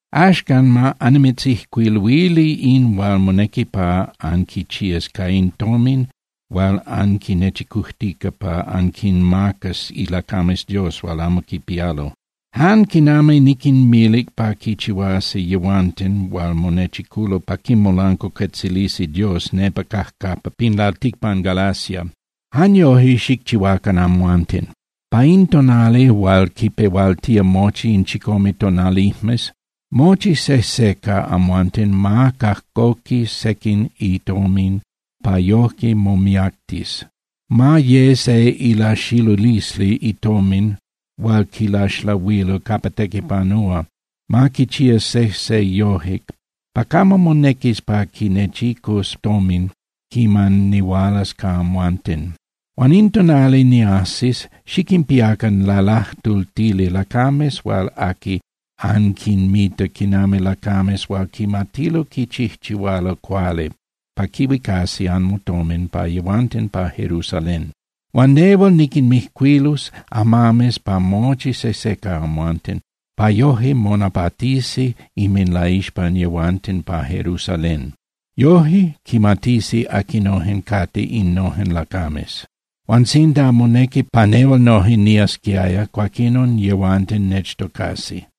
Axcan ma annimitzijcuiluili in hual monequi pa anquichías ca in tomin hual anquinechicujtica pa anquinmacas ilacames Dios hual amo quipialo. Jan quinami niquinmilic pa quichihuasi yehuanten hual monechiculo pa quimolancuacuetzilisi Dios nepa cajcapa pin lalticpan Galacia, jan yoje xicchihuacan amhuanten. Pa in tonali hual quipehualtía mochi in chicome tonalijmes, mochi sejse ca amhuanten ma cajcoqui sequin itomin pa yoje momiactis, ma ye se ilaxilulisli itomin hual quilaxlahuilo capa tequipanúa. Ma quichía sejse yoje pa camo monequis pa quinechicus tomin quiman nihualas ca amhuanten. Huan in tonali niajsis, xiquinpiacan lalajtultili lacames hual aqui anquinmita quinami lacames hual quimatilo quichijchihualo cuali pa quihuicasi anmotomin pa yehuanten pa Jerusalén. Huan nehual niquinmijcuilus amames pa mochi sejse ca yehuanten, pa yoje monapatisi inminlaixpan yehuanten pa Jerusalén. Yoje quimatisi aquinojen cate innojen lacames. Huan sinda monequi pa nehual noje niasquiaya, cuaquinon yehuanten nechtocasi.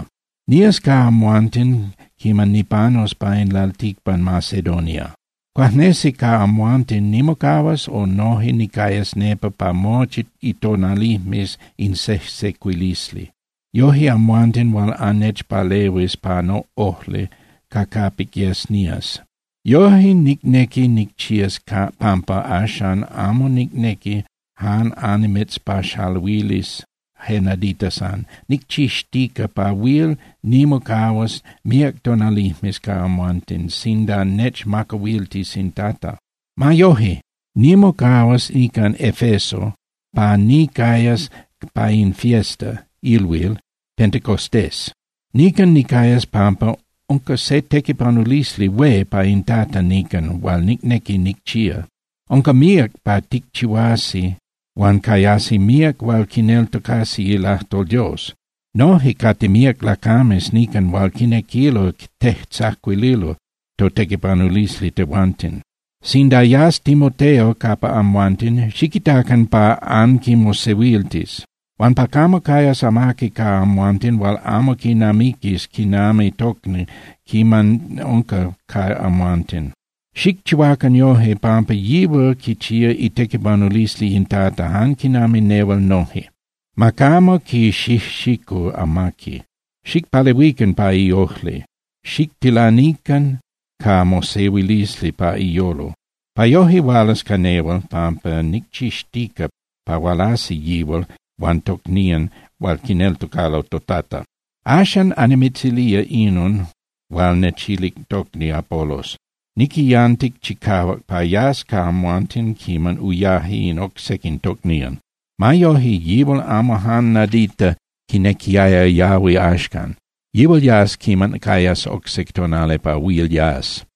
Nías ca amhuanten quiman nipanus pa in lalticpan Macedonia. Cuajnesi ca amhuanten nimocahuas o noje nicayas nepa pa mochi itonalijmes in sejsecuilisli. Yoje amhuanten huil annechpalehuis pa noꞌojli ca capic yes nías. Yoje nicnequi nicchías pampa axan amo nicnequi jan annimitzpaxaluilis je nadita san. Nicchixtica pa huil nimocahuas míac tonalijmes ca amhuanten sinda nechmacahuiltis in Tata. Ma yoje, nimocahuas nican Efeso pa nicayas pa in fiesta (ilhuil) Pentecostés. Nican nicayas pampa unca se tequipanulisli hué pa in Tata nican hual nicnequi nicchía. Unca míac pa ticchihuasi huan cayasi míac hual quineltocasi ilajtol Dios. Noje cate míac lacames nican hual quinequilo tejtzacuililo totequipanulisli tehuanten. Sinda yas Timoteo capa amhuanten, xiquitacan pa anquimosehuiltis huan pa camo cayas amaqui ca amhuanten hual amo quinamiquis quinami tocni quiman unca ca amhuanten. Xicchihuacan yoje, pampa yihual quichía itequipanulisli in Tata jan quinami nehual noje. Ma camo quixijxicu amaqui. Xicpalehuican pa iojli, xictilanican ca mosehuilisli pa iyolo, pa yoje hualas ca nehual, pampa nicchixtica pa hualasi yihual huan tocnían hual quineltocalo toTata. Axan annimitzilía inon hual nechilic tocni Apolos. Niquiyantic chicahuac pa yas ca amhuanten quiman uyaje in oc sequin tocnían. Ma yoje, yihual amo jan nadita quinequiaya yahui axcan. Yihual yas quiman cayas oc se tonali pa huil yas.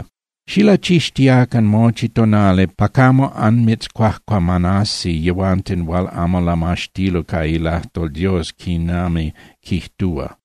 Xilachixtiacan mochi tonali pa camo anmitzcuajcuamanasi yehuanten hual amo lamaxtilo ca ilajtol Dios quinami quijtúa.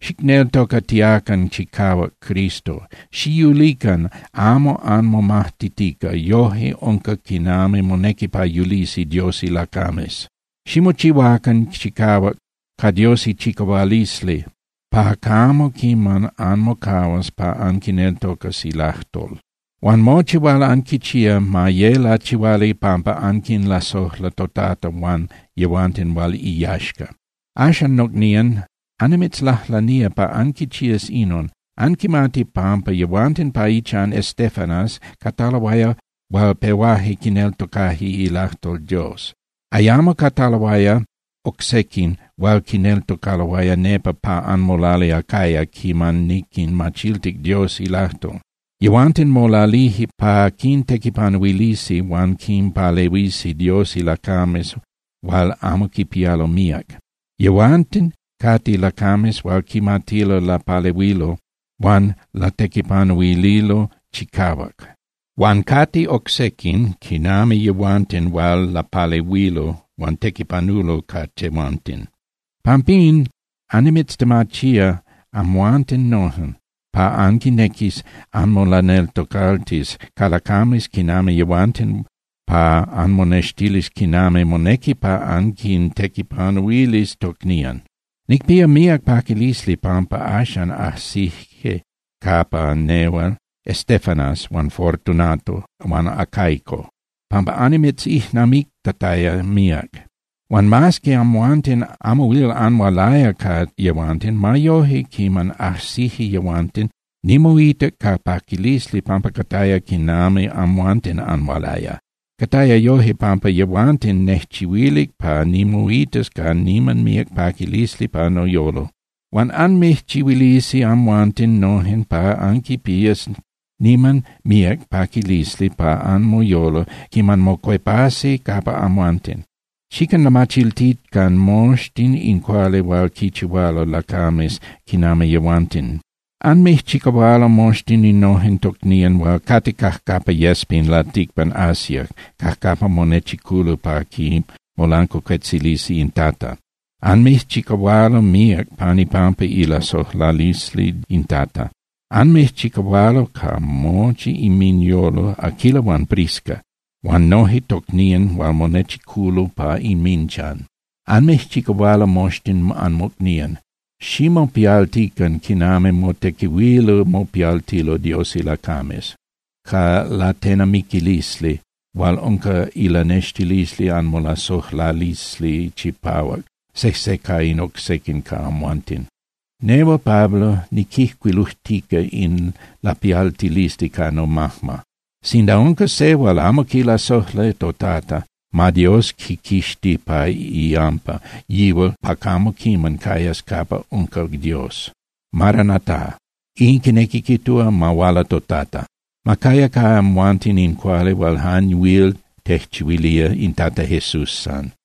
Xicneltocatiacan chicahuac Cristo. Xiyulican amo anmomajtitica, yoje unca quinami monequi pa yulisi Dios ilacames. Ximochihuacan chicahuac ca Dios ichicahualisli pa camo quiman anmocahuas pa anquineltocas ilajtol. Huan mochi hual anquichía, ma ye lachihuali pampa anquinlasojla toTata huan yehuanten hual iyaxca. Axan, nocnían, annimitzlajlanía pa anquichías inon. Anquimati pampa yehuanten pa ichan Estéfanas cataloaya hual pehuaje quineltocaje ilajtol Dios. Ayamo cataloaya oc sequin hual quineltocaloaya nepa pa anmolali Acaya quiman niquinmachiltic Dios ilajtol. Yehuanten molalije pa quintequipanuilisi huan quinpalehuisi Dios ilacames hual amo quipialo míac. Yehuanten cate lacames hual quimatilo lapalehuilo huan latequipanuililo chicahuac. Huan cate oc sequin quinami yehuanten hual lapalehuilo huan tequipanulo ca tehuanten. Pampín, annimitztemachía amhuanten noje, pa anquinequis anmolaneltocaltis ca lacames quinami yehuanten pa anmonextilis quinami monequi pa anquintequipanuilis tocnían. Nicpía míac paquilisli pampa axan ajsije capa nehual Estéfanas huan Fortunato huan Acaico, pampa annimitzijnamictataya míac. Huan mas que amhuanten amo huil anhualaya ca yehuanten, ma yoje quiman ajsije yehuanten, nimoitac ca paquilisli pampa cataya quinami amhuanten anhualaya. Cataya yoje pampa yehuanten nejchihuilic pa nimoitas ca niman míac paquilisli pa noyolo. Huan anmijchihuilisi amhuanten nojen pa anquipías niman míac paquilisli pa anmoyolo quiman mocuepasi capa amhuanten. Xiquinlamachiltican moxtin in cuali hual quichihualo lacames quinami yehuanten. Anmijchicahualo moxtin innojen tocnían hual cate cajcapa yes pin lalticpan Asia cajcapa monechiculo pa quimolancuacuetzilisi in Tata. Anmijchicahualo míac pan ipampa ilasojlalisli in Tata. Anmijchicahualo ca mochi inminyolo Aquila huan Prisca huan noje tocnían hual monechiculo pa inminchan. Anmijchicahualo moxtin anmocnían. Ximopialtican quinami motequihuilo mopialtilo Dios ilacames, ca latenamiquilisli hual unca ilanextilisli anmolasojlalisli chipahuac sejse ca in oc sequin ca amhuanten. Nehual Pablo niquijcuilujtica in lapialtilisli ca nomajma. Sinda unca se hual amo quilasojla toTata, ma Dios quiquixti pa iyampa yihual pa camo quiman cayas capa unca Dios. ¡Maranata! In quinequi quijtúa ¡Ma huala toTata! Ma caya ca amhuanten in cuali hual jan huil tejchihuilía in Tata Jesús san.